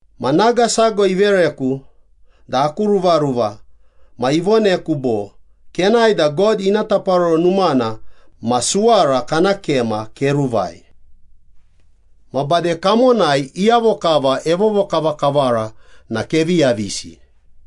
Ma naga sago ivereku da aku ruvaruva ma ivoneku bo, “Kenae da God ina Taparoro Numana ma suwara kana kema keruvai. Ma bade kamonai iyavo kava evovokavakavara na kevi yavisi.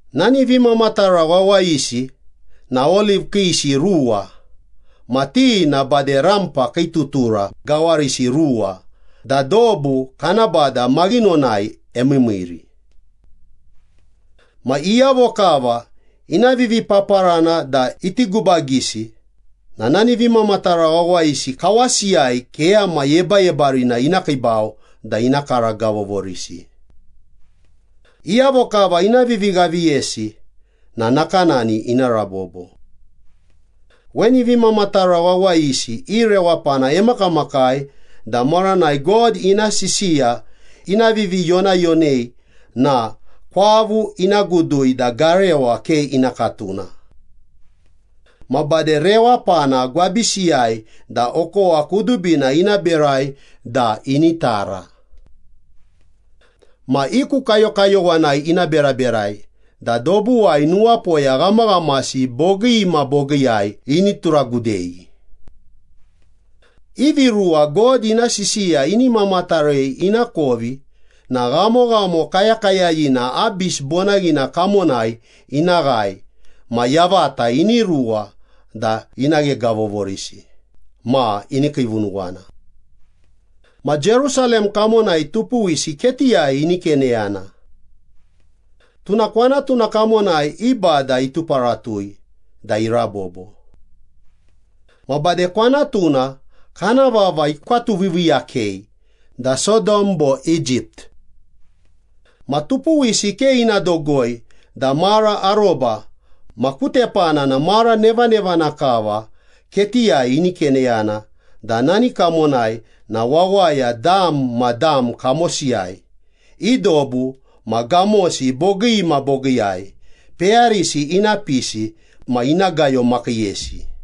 Nani vimamatara wawayisi na oliv kiisi ruwa ma ti na bade rampa kii tutura gawarisi ruwa da dobu kana Bada maghinonai emiimiiri. Ma iyavo kava ina vivipaparana da iti gubagisi na nani vimamatara wawayisi kawasiyai keyama yebayebarina ina kiibau da ina karagavovorisi. Iyavo kava ina vivighaviyesi na nakanani ina rabobo. Weni vimamatara wawayisi i rewapana emakamakai da maranai God ina sisiya ina viviyonayonei na kwavu ina gudui da garewa ke ina katuna. Ma bade rewapana gwabisiyai da okowa kudubina ina berai da ini tara. Ma i ku kayokayowanai ina beraberai da dobuwai nuwapoya ghamaghamasi bogii ma bogiiyai ini turagudei. Ivi ruwa God ina sisiya ini mamatarei ina kovi na ghamoghamo kayakayayina Abis bonaghina kamonai ina ghae ma yavata ini ruwa da ina ghegavovorisi ma ini kiivunuwana. Ma Jerusalem kamonai tupuwisi ketiyai ini keneyana. Tuna kwanatuna kamonai i Bada ituparatui da irabobo. Ma bade kwanatuna kana vava ikwatuviiviiyakei da Sodom bo Egypt. Ma tupuwisi ke ina dogoi da mara aroba ma ku tepana na mara nevanevana kava ketiyai ini keneyana da nani kamonai na wawaya dam ma dam kamosiyai, i dobu ma gamosi bogii ma bogiiyai, peyarisi ina pisi ma ina gayomakiiyesi.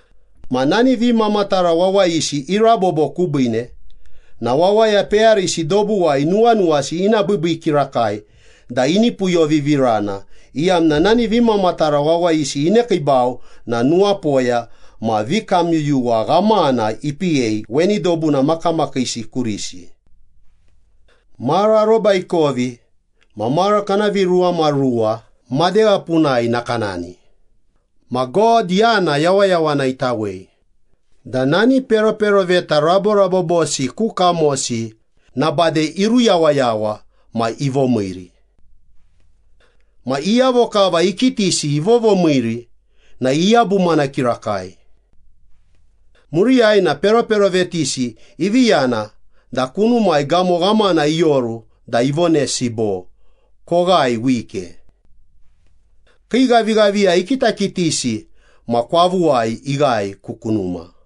Ma nani vimamatara wawayisi irabobo kubiine na wawaya peyarisi dobuwai nuwanuwasi ina biibii kirakai da ini puyovivirana, iyamna nani vimamatara wawayisi inekiibau na nuwapoya ma vikamyuyuwa ghamana ipiyei weni dobuna makamakiisi kurisi. Mara aroba ikovi ma mara kana viruwamaruwa madegha punai nakanani ma God yana yawayawana itawei da nani peroperoveta raborabobosi ku kamosi na bade iruyawayawa ma ivomiiri. Ma iyavo kava ikitisi ivovomiiri na iyabumana kirakai. Muriyai na peroperovetisi ivi yana da kunumai gamo ghamana ioru da ivonesi bo, “Koghae wike.” Kii ghavighaviya ikitakitisi ma kwavuwai ighae ku kunuma.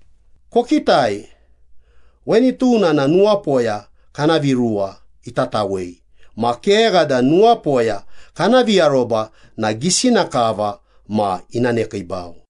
Kokitai, weni tuna na nuwapoya kana viruwa itatawei ma kegha da nuwapoya kana viaroba na gisina kava ma ina nekiibau.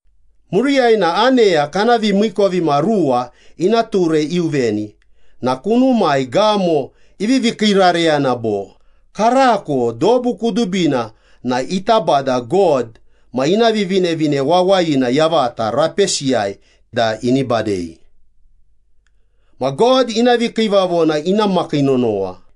Muriyai na aneya kana vimiikovimaruwa ina ture iuveni na kunumai gamo ivivi kiirareyana bo, “Karako dobu kudubina na ita Bada God ma ina Vivinevine Wawayina yavata rapesiyai da ini badei. Ma God ina vikiivavona ina makii nonowa.”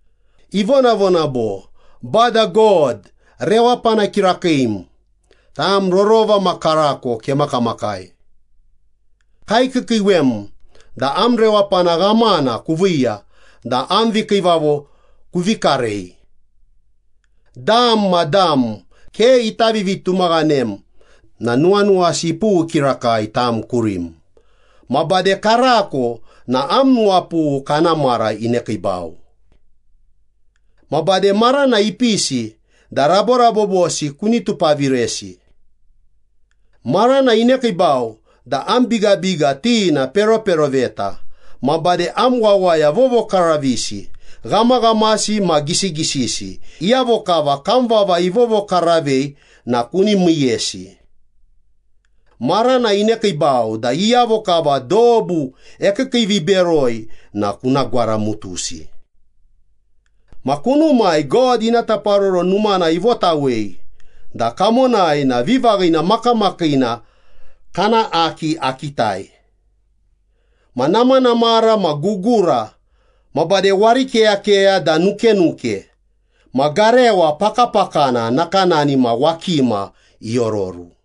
Ivonavona bo, “Bada God rewapana kirakiim, tam rorova ma karako kemakamakai. Kaikiikiiwem da am rewapana ghamana kuviiya da am vikiivavo kuvi karei. Dam ma dam ke ita vivitumaghanem na nuwanuwasi ipughu kirakai tam kurim, ma bade karako na am nuwapughu kana mara inekiibau. Ma bade marana ipisi da raborabobosi kuni tupaviresi. Marana inekiibau da am bigabiga ti na peroperoveta, ma bade am wawaya vovokaravisi, ghamaghamasi ma gisigisisi, iyavo kava kam vava ivovokaravei na kuni miiyesi. Marana inekiibau da iyavo kava dobu ekiikiiviberoi na kuna gwaramutusi.” Ma kunumai God ina Taparoro Numana ivotawei da kamonai na vivaghina makamakiina kana Aki akitai. Ma namanamara ma gugura ma bade warikeyakeya da nukenuke ma garewa pakapakana nakanani ma wakima iororu.